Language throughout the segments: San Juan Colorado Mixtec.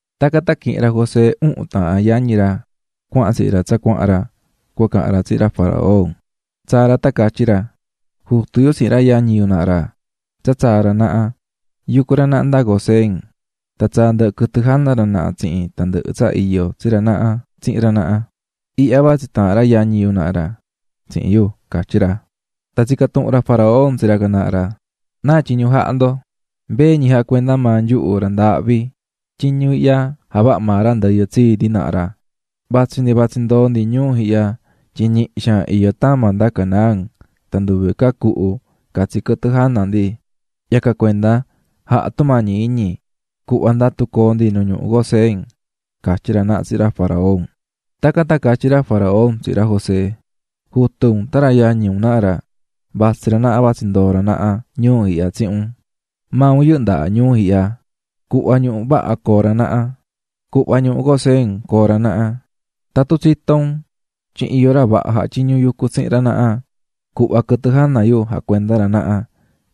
Tacan tan quihi̱n ra José uhun taahán yañi ra cuahan tsihin ra tsa cuahan ra cua cahan ra tsihin ra faraón, tsaa̱ ra tan catyí ra: ―Jutu yu tsihin ra yañi yu naha ra tsa tsaa̱ ra naha, yucú ra naha nda Gosén. Tan tsaa̱ ndɨhɨ quɨtɨ jana ra naha tsihin tandɨhɨ tsa iyó tsi ra naha tsihin ra naha. Ihya vatsí taahan ra yañi yu naha ra tsihin yu --catyí ra. Tan tsica̱ tuhun ra faraón tsi ra can naha ra: --¿Náa tyiñu jahá ndo? --Mbee ñi jacuendá maa nyuhu ra ndaahvi, tyiñu ihya javaha̱ maa ra ndɨyɨ tsii ndi naha ra. Vatsí ndi vatsí ndoo ndi ñuu ihya tyin ñihi xaan iyó tama nda Canaán tan nduve ca cuhu catsi quɨtɨ jana ndi, yacan cuenda, ja̱ha tumañi iñi cu̱hva ndatu coo ndi nu ñuhu Gosén ―catyí ra naha tsihin ra faraón. Tacan tan catyí ra faraón tsihin ra José: --Jutu un tan ra yañi un ihya naha ra, vatsí ra naha vatsí ndoo ra naha ñuu ihya tsihin un. Maa un yɨhɨ́ ndaha ñuhu ihya, cu̱hva ñuhu vaha coo ra naha, cu̱hva ñuhu Gosén coo ra naha. Tatun tsitó un tyin iyó ra vaha jatyiñú yucú tsihin ra naha, cu̱hva quɨtɨ jana yu jacuenda ra naha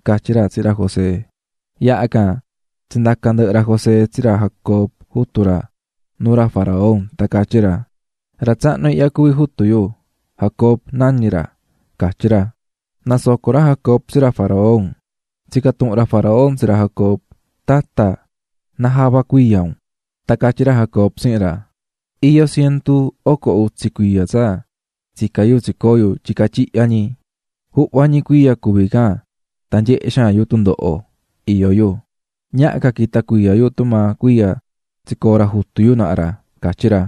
--catyí ra tsihin ra José. Yaha can tsindaca̱ ndɨhɨ ra José tsi ra Jacob, jutu ra, nuu ra faraón tan catyí ra: --Ra tsahnu ihya cuví jutu yu, Jacob nañí ra --catyí ra. Nasoco̱ ra Jacob tsi ra faraón. Tsica̱ tuhun ra faraón tsi ra Jacob: --Tata, ¿náa java cuiya un? Tan catyí ra Jacob tsihin ra: --Iyó cientu oco utsi cuiya tsa tsicá yu tsicoo̱ yu tyica tyihya ñi. Juhva ñi cuiya cuví can tan nyehé xaan yu tundoho iyó yu, ñaha ca quita cuiya yu tumaa cuiya tsicoo̱ ra jutu yu naha ra --catyí ra.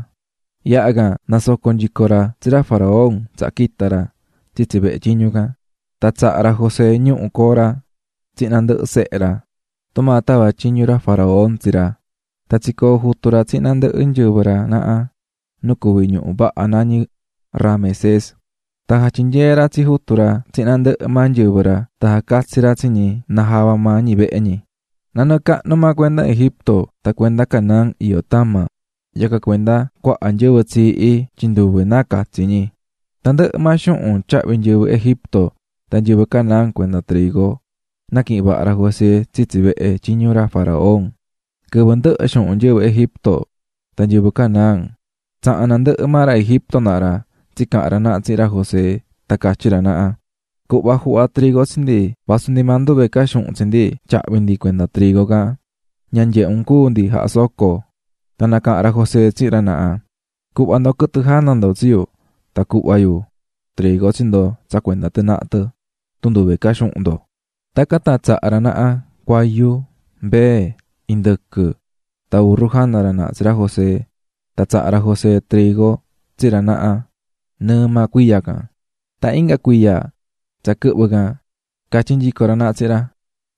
Yaha can nasoco̱ nyico ra tsi ra faraón tsaha quita̱ ra tsitsi vehe tyiñu can. Tan tsaha̱ ra José ñuhu coo ra tsihin nandɨhɨ sehe ra, tumaa tava̱ tyiñu ra faraón tsi ra, tan tsicoo̱ jutu ra tsihin nandɨhɨ nyɨvɨ ra naha nu cuví ñuhu vaha nañí Ramesés. Tan jatyinyee̱ ra tsi jutu ra tsihin nandɨhɨ maa nyɨvɨ ra tan jacatsi̱ ra tsi ñi najava maa ñi vehe ñi. Nanɨɨ cahnu maa cuenda Egipto tan cuenda Canaán iyó tama, yacan cuenda cuaha nyɨvɨ tsiihí tyin nduve náa catsi ñi. Tandɨhɨ maa xuhun tyahví nyɨvɨ Egipto tan nyɨvɨ Canaán cuenda trigo, naquihi̱n vaha ra José tsitsi vehe tyiñu ra faraón. Quɨvɨ ndɨhɨ̱ xuhun nyɨvɨ Egipto tan nyɨvɨ Canaán, tsaha̱n nandɨhɨ maa ra Egipto naha ra tsicaha̱n ra naha tsihin ra José tan catyí ra naha: ―Cu̱hva juhva trigo tsi ndi, vasu ndi maa nduve ca xuhun tsi ndi tyahvi ndi cuenda trigo can, ña nyehe un cúu ndi jahá soco. Tan nacaha̱n ra José tsihin ra naha: --Cu̱hva ndo quɨtɨ jana ndo tsi yu tan cuhva yu trigo tsi ndo tsa cuenda tɨ naha tɨ tun nduve ca xuhun ndo. Tacan tan tsaha̱ ra naha cuayu, mbee, indɨquɨ tan urru jana ra naha tsi ra José tan tsaha̱ ra José trigo tsi ra naha nɨɨ maa cuiya can. Tan inga cuiya tsa quɨhvɨ̱ can catyí nyico ra naha tsihin ra: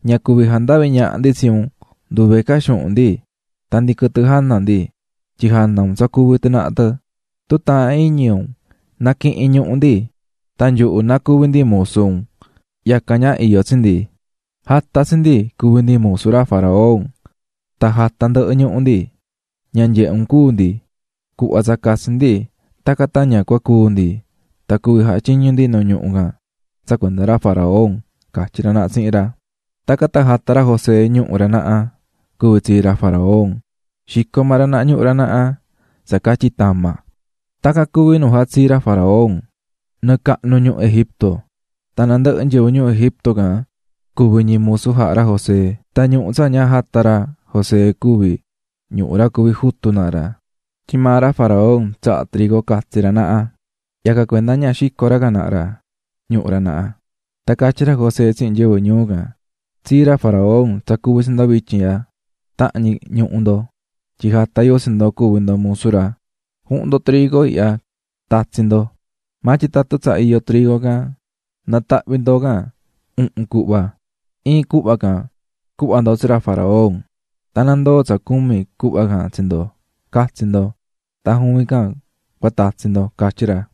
--Ña cuvi jandavi ñaha ndi tsi un, nduve ca xuhun ndi tan ndi quɨtɨ jana ndi, tyin jana un tsa cuví tɨ naha tɨ. Tun taahán iñi un, na̱quihin ñuhu ndi tan nyuhu na cuvi ndi musu un, yacan ña iyó tsi ndi. Ja̱ta tsi ndi cuvi ndi musu ra faraón tan ja̱ta ndɨhɨ ñuhu ndi, ña nyehe un cúu ndi. Cu̱hva tsa catsi ndi tacan tan ña cúu ndi tan cuvi jatyiñu ndi nu ñuhu can tsa cuenda ra faraón --catyí ra naha tsihin ra. Tacan tan jata̱ ra José ñuhu ra naha cuvi tsii ra faraón, xico̱ maa ra naha ñuhu ra naha tsa catyi tama. Tacan cuví nu jatsii̱ ra faraón nɨɨ cahnu ñuhu Egipto. Tan nandɨhɨ nyɨvɨ ñuu Egipto can cuvi̱ ñi musu jaha̱ ra José. Tan ñuhu tsa ña jata̱ ra José cuví ñuhu ra cuví jutu naha ra, tyin maa ra faraón tsahá trigo catsi ra naha, yacan cuenda ña xico̱ ra can naha ra ñuhu ra naha. Tan catyí ra José tsihin nyɨvɨ ñuu can: --Tsii ra faraón tsa cuví tsi ndo vityin ihya tahan ñi ñuhu ndo, tyin jata̱ yu tsi ndo cuvi ndo musu ra, ju̱hun ndo trigo ihya tatsi ndo. Maa tyin tatun tsa iyo trigo can, na̱tahvi ndo can uhun cuhva, iin cuhva can cuhva ndo tsi ra faraón tan na ndoo tsa cumi cuhva can tsi ndo catsi ndo tan juvin can cua tatsi ndo --catyí ra.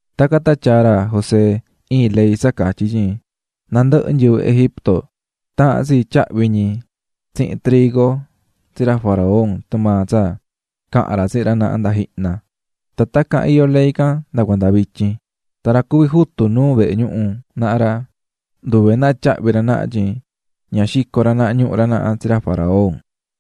Tacan tan tyaa̱ ra José iin ley tsa catyí tyin nandɨhɨ nyɨvɨ Egipto taahán tsi tyahvi ñi tsihin trigo tsi ra faraón tumaa tsa caha̱n ra tsihin ra naha nda jihna, tan tacan iyó ley can nda cuanda vityin. Tan ra cuví jutu nuu vehe ñuhu naha ra, nduve náa tyahvi ra naha tyin ña xico̱ ra naha ñuhu ra naha tsi ra faraón.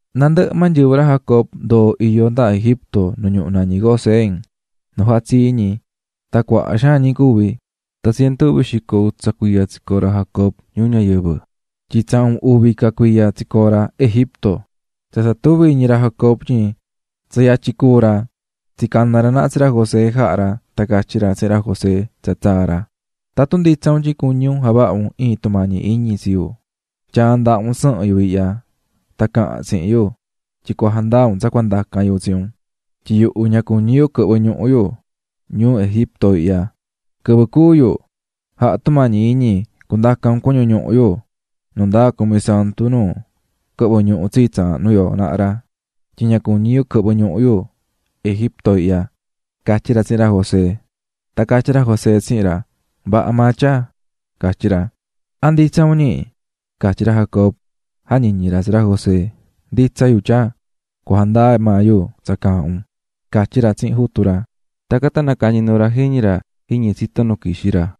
Nandɨhɨ maa nyɨvɨ ra Jacob ndoo̱ iyó nda Egipto nu ñuhu nañí Gosén, nu jatsii̱ ñi, tan cuaha xaan ñi cuvi̱. Tan cientu uvi xico utsa cuiya tsicoo̱ ra Jacob ñuu ñayɨvɨ, tyin tsahun uvi ca cuiya tsicoo̱ ra Egipto. Tsa tsa tuví iñi ra Jacob tyin tsa yatyin cúu ra, tsicana̱ ra naha tsi ra José jaha̱ ra tan catyí ra tsihin ra José tsa tsaa̱ ra: --Tatun nditsa un tyin cuñí un javaha un iin tumañi iñi tsi yu, tya̱a ndaha un sɨhɨn yu ihya, tan cahan tsihin yu tyin cua jandaa un tsa cua ndacan yu tsi un, tyin yuhu ña cuñí yu quɨhvɨ ñuhu yu ñuu Egipto ihya. Quɨvɨ cúu yu ja̱ha tumañi iñi cundaca un cuñu ñuhu yu nundaa cumi santu nu quɨhvɨ̱ ñuhu tsii tsaahnu yo naha ra, tyin ña cuñí yu quɨhvɨ ñuhu yu Egipto ihya --catyí ra tsihin ra José. Tan catyí ra José tsihin ra: --Vaha maa, tyaa --catyí ra. ―¿A nditsa un, ñi? --catyí ra Jacob jañiñí ra tsi ra José. --Nditsa yu, tyaa, cua jandaa maa yu tsa caahán un --catyí ra tsihin jutu ra. Tacan tan nacañi̱ nuu ra jiñi ra jiñi tsito nu quixí ra.